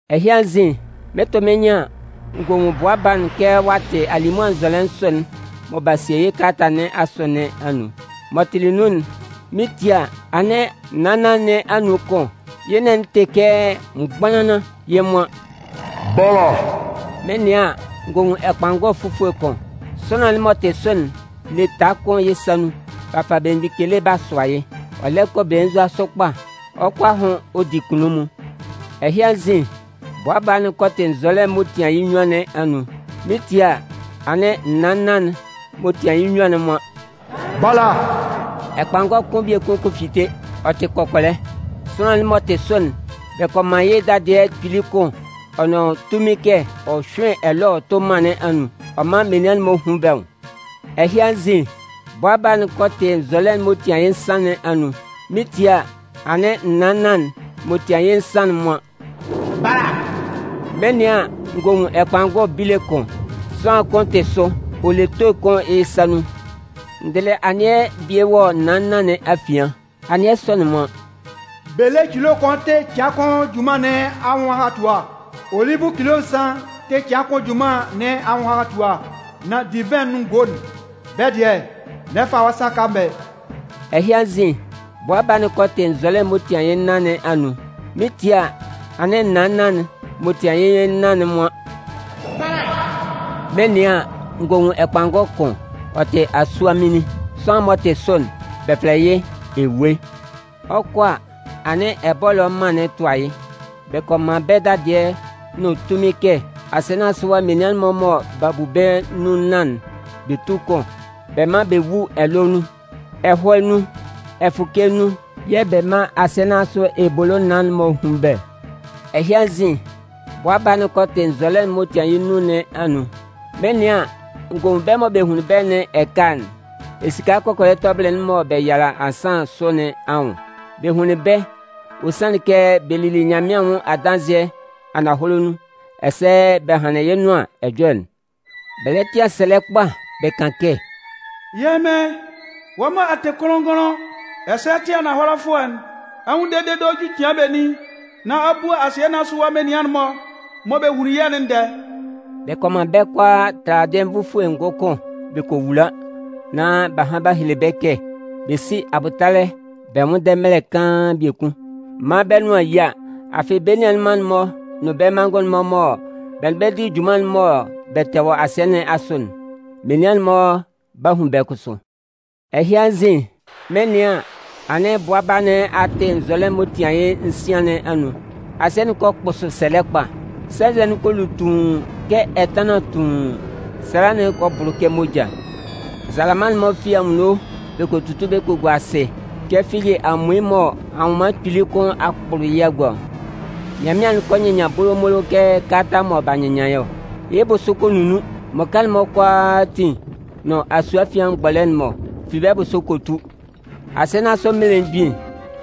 Ɛhɩ anzin, mɩn 'tʋ mɩ́n nyɩn an, n gɔ nwun Bʋa Baa'n kɛ ɔ'a tɩ alimʋa nzɔlɛ nsʋ'n mɔ b'a sie yɩ́ kalata nɩn asʋ nɩn anun. M'ɔ tɩlɩ nun'n, mɩn 'tie a, anɩn naan nnan nɩn anun kʋn, yɩ́ nɩn'n tɩ kɛ mgbanlanlan, yɩ́ nwan: ‘Bala!’ Mɩn 'nɩan an, n gɔ nwun ɛkpanngɔ fufue kʋn. Sʋanlan'n m'ɔ tɩ sʋ'n le taa kʋn yɩ́ sa nun. B'a fa belemgbin kele b'a sʋa yɩ́. Ɔ lɛ kɔ belenzua sʋ kpa ɔ 'kɔ a hʋn ɔ di kunnunmun. Ɛhɩ anzin, Bʋa Baa'n kɔ tɩ nzɔlɛ'n m'ɔ tian yɩ́ nnyuan nɩn anun. Mɩn 'tie a, anɩn naan nnan'n, m'ɔ tian yɩ́ nnyuan'n nwan: “Bala!” Ɛkpanngɔ kʋn biekun kɔ fite, ɔ tɩ kɔkɔlɛ. Sʋanlan'n m'ɔ tɩ sʋ'n, bɛ kɔ man yɩ́ dadɩɛ kpili kʋn ɔ nʋn tunmin kɛ ɔ hyʋ́ɩn ɛlɔɛ ɔ tʋ́ mân nɩn anun, ɔ mán menian'n-mɔ hún bɛ́ nwʋn. Ɛhɩ anzin, Bʋa Baa'n kɔ tɩ nzɔlɛ'n m'ɔ tian yɩ́ nsan nɩn anun. Mɩn 'tie a, anɩn naan nnan'n, m'ɔ 'tian yɩ́ nsan'n, nwan: “Bala!” Mɩn 'nɩan an, n gɔ nwun ɛkpanngɔ bile kʋn. Sʋanlan kʋn tɩ sʋ. Ɔ le toe kʋn yɩ́ sa nun. N dɩlɩ anɩɛ bie wɔ naan nnan nɩn afian. Anɩɛ sɔ'n nwan: “Bele cilo kʋn tɩ cɩan kʋn junman nɩn anwʋn ahatua. Ɔlɩzʋ cilo nsan tɩ cɩan kʋn junman nɩn anwʋn ahatua. Nan divɩn nʋn ngo'n, bɛ́ dɩɛ, n'ɛ fa wɔ́ sa kan bɛ́.” Ɛhɩ anzin, Bʋa Baa'n kɔ tɩ nzɔlɛ'n m'ɔ tian yɩ́ nnan nɩn anun. Mɩn 'tie a, anɩn naan nnan'n, m'ɔ tian yɩ́ nnan'n nwan: ‘Bala!’ Mɩn 'nɩan an, n gɔ nwun ɛkpanngɔ kʋn. Ɔ tɩ asuaminlin. Sʋanlan'n m'ɔ tɩ sʋ'n, bɛ fɛlɛ yɩ́ “Ewue”. Ɔ 'kɔ a, anɩn ɛbɔlɔ mân'n tʋa yɩ́. Bɛ kɔ man bɛ́ dadɩɛ nʋn tunmin kɛ asɩɛ nɩn asʋ ɛwa menian'n-mɔ mɔ b'a bu bɛ́ nun nnan'n, bɛ tú kʋn. Bɛ mán bɛ wú ɛlɔɛ nun, ɛhɔɛ nun, ɛfʋkɛ nun yɛ̂ bɛ mán asɩɛ nɩn asʋ ebolo naan'n-mɔ hún bɛ́. Ɛhɩ anzin, Bʋa Baa'n kɔ tɩ nzɔlɛ'n m'ɔ tɩan yɩ́ nnun nɩn anun. Mɩn 'nɩan an, n gɔ nwun bɛ́ mɔ bɛ hunlin bɛ́ nɩn ɛkala'n esika kɔkɔlɛ tɔbɩlɩ'n mɔ bɛ yala ansan sʋ nɩn anwʋn. Bɛ hunlin bɛ́, ɔ sanlɩn kɛ bɛ lili Nyanmɩan anwʋn adanzɩɛ ananhɔlɛ nun ɛsɛ bɛ hanlɩn yɩ́ Nʋan Ɛjɔlɛ'n. Bɛ lɛ tɩan sɛlɛ kpa bɛ kan kɛ: “Yɛ́ Mɩn, wɔ́ mɔ ɛ tɩ kʋnlʋn-ngʋnlʋn, ɛsɛ ɛ tɩ ananhɔlɛfʋɛ'n, ɛ 'nwʋnndɛ dede ɔ ju cɩan benin nán a bua asɩɛ nɩn asʋ menian'n-mɔ mɔ bɛ hunlin yɛ́'n ndɛɛ?” Bɛ kɔ man bɛ́ kʋalaa taladɩɛ nvʋfue ngʋkʋn bɛ kɔ wula nán b'a han b'a hele bɛ́ kɛ bɛ sí abʋtalɛ bɛ nwʋ́nndɛ mɛlɛ kaan biekun, maan bɛ́ nʋan yía. Afɩ bɛ́ nianman'n-mɔ nʋn bɛ́ manngʋn'n-mɔ mɔ bɛ nʋn bɛ di junman'n mɔ bɛ tɛ wɔ asɩɛ nɩn asʋ'n, menian'n-mɔ 'ba hun bɛ́ kʋsʋ. Ɛhɩ anzin, mɩn 'nɩan an, anɩn Bʋa Baa nɩn a tɩ nzɔlɛ'n m'ɔ tɩan yɩ́ nsian nɩn anun. Asɩɛ'n kɔ kpʋsʋ sɛlɛ kpa. Sɛnzɛ'n kɔ lu tuun kɛ ɛtanlan tuun. Sala'n kɔ bʋlʋ kɛ moja. Nzalama'n-mɔ fi anwunno bɛ kɔ tutu bɛ kɔ gua asɩ kɛ figi amuin mɔ anwʋnman kpili kʋn a kpʋlʋ yɩ́ a gua ɔ. Nyanmɩan'n kɔ nyɩnnyan bolomolo kɛ kalata mɔ b'a nyɩnnyan ɔ. Yɩ́ bʋsʋ kɔ nunnun. Mmʋka'n-mɔ kʋalaatin nʋn asue afian mgbɔlɛ'n-mɔ fi bɛ́ bʋsʋ kɔ tu. Asɩɛ nɩn asʋ mmelemgbin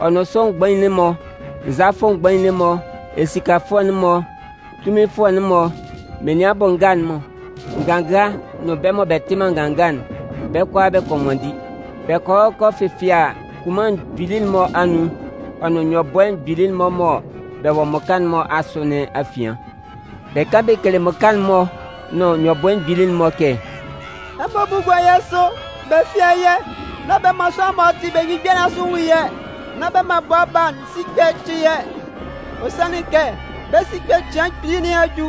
ɔ nʋn sʋ mgbain'n-mɔ, nzalafʋ mgbain'n-mɔ, esikafʋɛ'n-mɔ, tunminfʋɛ'n-mɔ, menian bʋ nga'n-mɔ, nganga nʋn bɛ́ mɔ bɛ tɩ man nganga'n, bɛ́ kʋalaa bɛ kɔ nwanndi. Bɛ kɔ hɔ bɛ kɔ fɛfɩɛ kunman mgbili'n-mɔ anun, ɔ nʋn nyɔbʋɛ mgbili'n-mɔ mɔ bɛ wɔ mmʋka'n-mɔ asʋ nɩn afian. Bɛ kan bɛ kele mmʋka'n-mɔ, nʋn nyɔbʋɛ mgbili'n-mɔ kɛ: “Ɛmɔ bú gúa yɛ́ sʋ, bɛ fɩ́a yɛ́. Nán bɛ man sʋanlan'n m'ɔ tɩ belemgbin bia nɩn asʋ'n nwun yɛ́. Nán bɛ man Bʋa Baa'n sikpɛ cɩ yɛ́. Ɔ sanlɩn kɛ bɛ́ sikpɛ cɩan kpili nɩn a ju.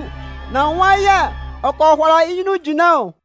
Nan nwan yɛ̂ ɔ kɔ hʋala yɩ́ nyunnun jinlan ɔ.”